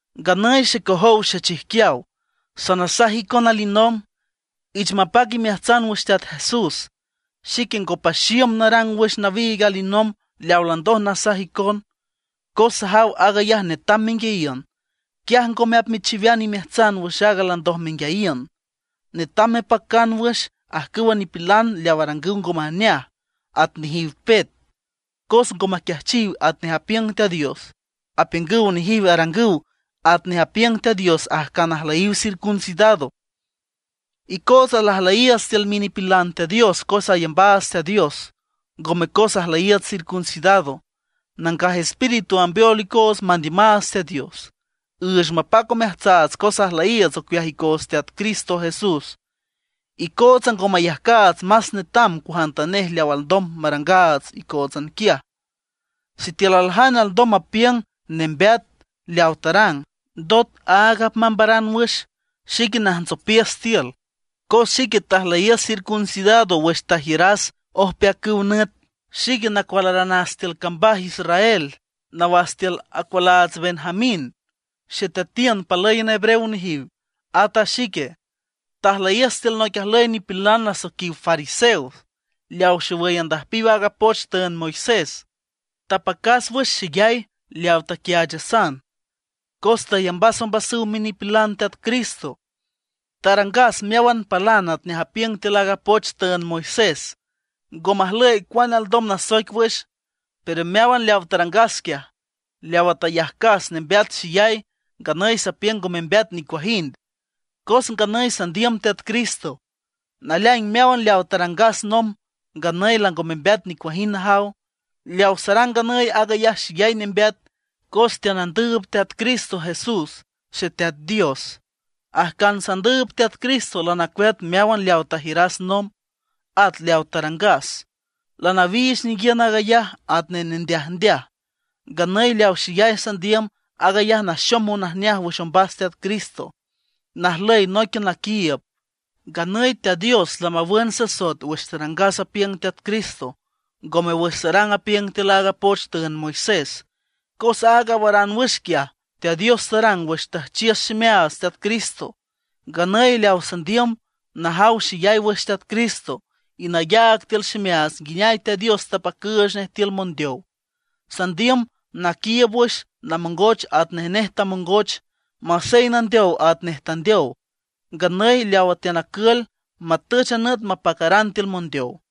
Nganüy xecojow xechijquiaw, sanasaj icon alinomb, ich mapac imeajtsan wüx Teat Jesús. Xique ngo paxiüm narang wüx nawiig alinomb leaw landoj lanasaj icon, cos sajaw aag ayaj netam menguiayiün; quiaj ngome apmechiwean imeajtsan wüx aaga landoj menguiayiün. Netam mepacan wüx ajcüwa nipilan leaw arangüw ngo majneaj, at nejiw pet. Cos ngo maquiajchiw atnej apiüng Teat Dios; apiüngüw nejiw arangüw atnej apiüng Teat Dios ajcan ajlüyiw circuncidado. Icootsa lajlüyiiüts tiül minipilan Teat Dios cos ayambaats Teat Dios, ngome cos ajlüyiiüts circuncidado. Nangaj Espíritu ambeol icoots mandiümaats Teat Dios; üüch mapac omeajtsaats cos ajlüyiiüts ocueaj icoots Teat Cristo Jesús. Icootsa ngo mayajcaats más netam cuajantanej leaw alndom marangaats icóotsan quiaj. Sitiülme aljane alndom mapiüng nembeat leawa tarang, ndot aag apmambaran wüx, xique najntsopiüs tiül. Cos xique tajlüyiüs circuncidado wüx tajiüras ojpeacüw nüt. Xique nacualaranas tiül cambaj Israel, nawas tiül acualaats Benjamín. Xeteatiün palǘyan hebreo nejiw, at a xique. Tajlüyiüs tiül noic ajlüy nipilan nasoiquiw fariseos, leaw xowüy andüjpiw aaga poch tüünd Moisés. Tapacas wüx xeyay leaw taquiaachasan, cos tayambas ombasüw minipilan Teat Cristo. Tarangas meáwan palan atnej apiüng tiül aaga poch tüünd Moisés; ngo majlüy cuane alndom nasoic wüx. Pero meáwan leawa tarangas quiaj, leawa tayajcas nembeat xeyay, nganüy sapiüng ngo membeat nicuajind, cos nganüy sandiüm Teat Cristo. Naleaing meáwan leaw tarangas nomb, nganüy lango membeat nicuajind najaw. Leaw sarang nganüy aag ayaj xeyay nembeat cos teanandüüb Teat Cristo Jesús Xeteat Dios. Ajcan sandüüb Teat Cristo lanacueat meáwan leawa tajiüras nomb, at leawa tarangas. Lanawiich ninguiün aag ayaj atnej nendeajndeaj. Nganüy leaw xeyay sandiüm, aag ayaj naxom monajneaj wüx ombas Teat Cristo, najlüy nóiquian naquiiüb. Nganüy Teat Dios lamawün sasoet wüx tarangas apiüng Teat Cristo, ngome wüx sarang apiüng tiül aaga poch tüünd Moisés. Cos aaga awaran wüx quiaj, Teat Dios tarang wüx tujchiüs ximeaats Teat Cristo. Nganüy leaw sandiüm, najaw xeyay wüx Teat Cristo, y nayaag tiül ximeaats nguineay Teat Dios tapacüüch nej tiül mondeow. Sandiüm naquiiüb wüx namongoch atnej nej tamongoch, masey nandeow atnej tandeow. Nganüy leawa teanacül, matüch a nüt mapacaran tiül mondeow.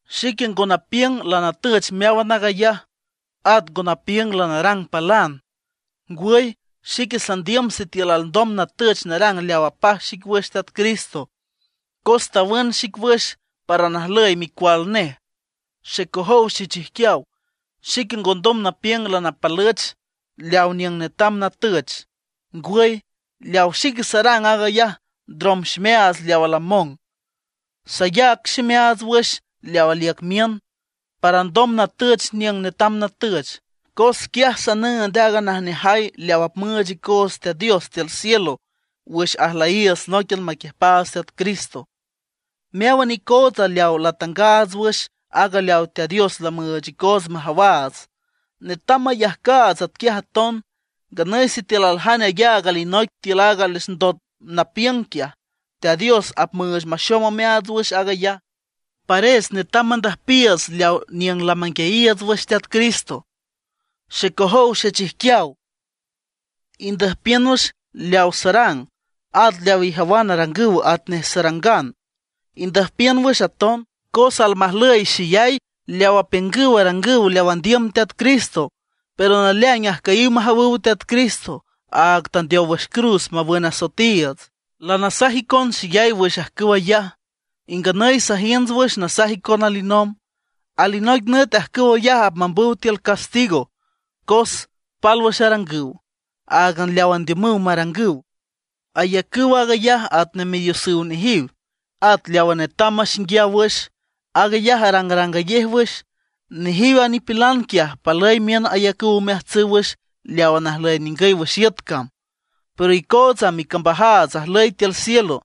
Xique ngo napiüng lanatüch meáwan aag ayaj, at ngo napiüng lanarang palan; ngwüy xique sandiüm sitiül alndom natüch narang leaw apaj xic wüx Teat Cristo. Cos tawün xic wüx para najlüy micual nej. Xecojow xechijquiaw, xique ngondom napiüng lanapalüch leaw niüng netam natüch. Ngwüy, leawa xique sarang, aag ayaj ndrom ximeaats leawa lamong; sayac ximeaats wüx leaw aliüc miün, para alndom natüch niüng netam natüch. Cos quiaj sanüünd aaga najneajay leaw apmüüch icoots Teat Dios tiül cielo wüx ajlüyiiüts nóiquian maquiüjpaats Teat Cristo. Meáwan icootsa leawa latangaats wüx aaga leawa Teat Dios lamüüch icoots majawaats, netam mayajcaats atquiaj aton. Nganüy sitiül aljane ayaag alinoic tiül aaga les ndot napiüng quiaj, Teat Dios apmüüch maxom omeaats wüx aag ayaj. Pares netam mandüjpiiüts leawa niüng lamanguiayiiüts wüx Teat Cristo. Xecojow xechijquiaw, indüjpiün wüx leawa sarang. At leaw ijawan arangüw atnej sarangan, indüjpiün wüx aton. Cos almajlüy xeyay leaw apiüngüw arangüw leaw andiüm Teat Cristo, pero naleaing ajcüyiw majawüw Teat Cristo, aag tandeow wüx cruz mawün asoetiiüts. Lanasaj icon xeyay wüx ajcüw ayaj, y nganüy sajiünts wüx nasaj icon alinomb. Alinoic nüt ajcüw ayaj apmambüw tiül castigo cos pálwüx arangüw, áagan leaw andiümüw marangüw; ayacüw aag ayaj atnej midiosüw nejiw. At leawa netam maxinguiaw wüx, aag ayaj arangrangayej wüx. Nejiw a nipilan quiaj palüy miün ayacüw omeajtsüw wüx leawa najlüy ningüy wüx iüt cam. Pero icootsa, micambajaats ajlüy tiül cielo.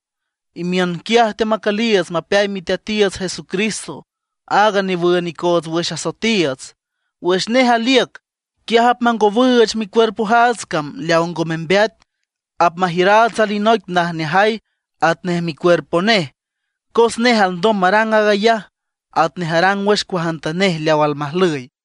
Imiün quiaj teamacüliiüts mapeay Miteatiiüts Jesucristo, aaga newün icoots wüx asoetiiüts. Wüx nej aliüc, quiaj apmangowüüch micuerpojaats cam leaw ngo membeat; apmajiüraats alinoic najneajay atnej micuerpo nej. Cos nej alndom marang ayaj, atnej arang wüx cuajantanej leaw almajlüy.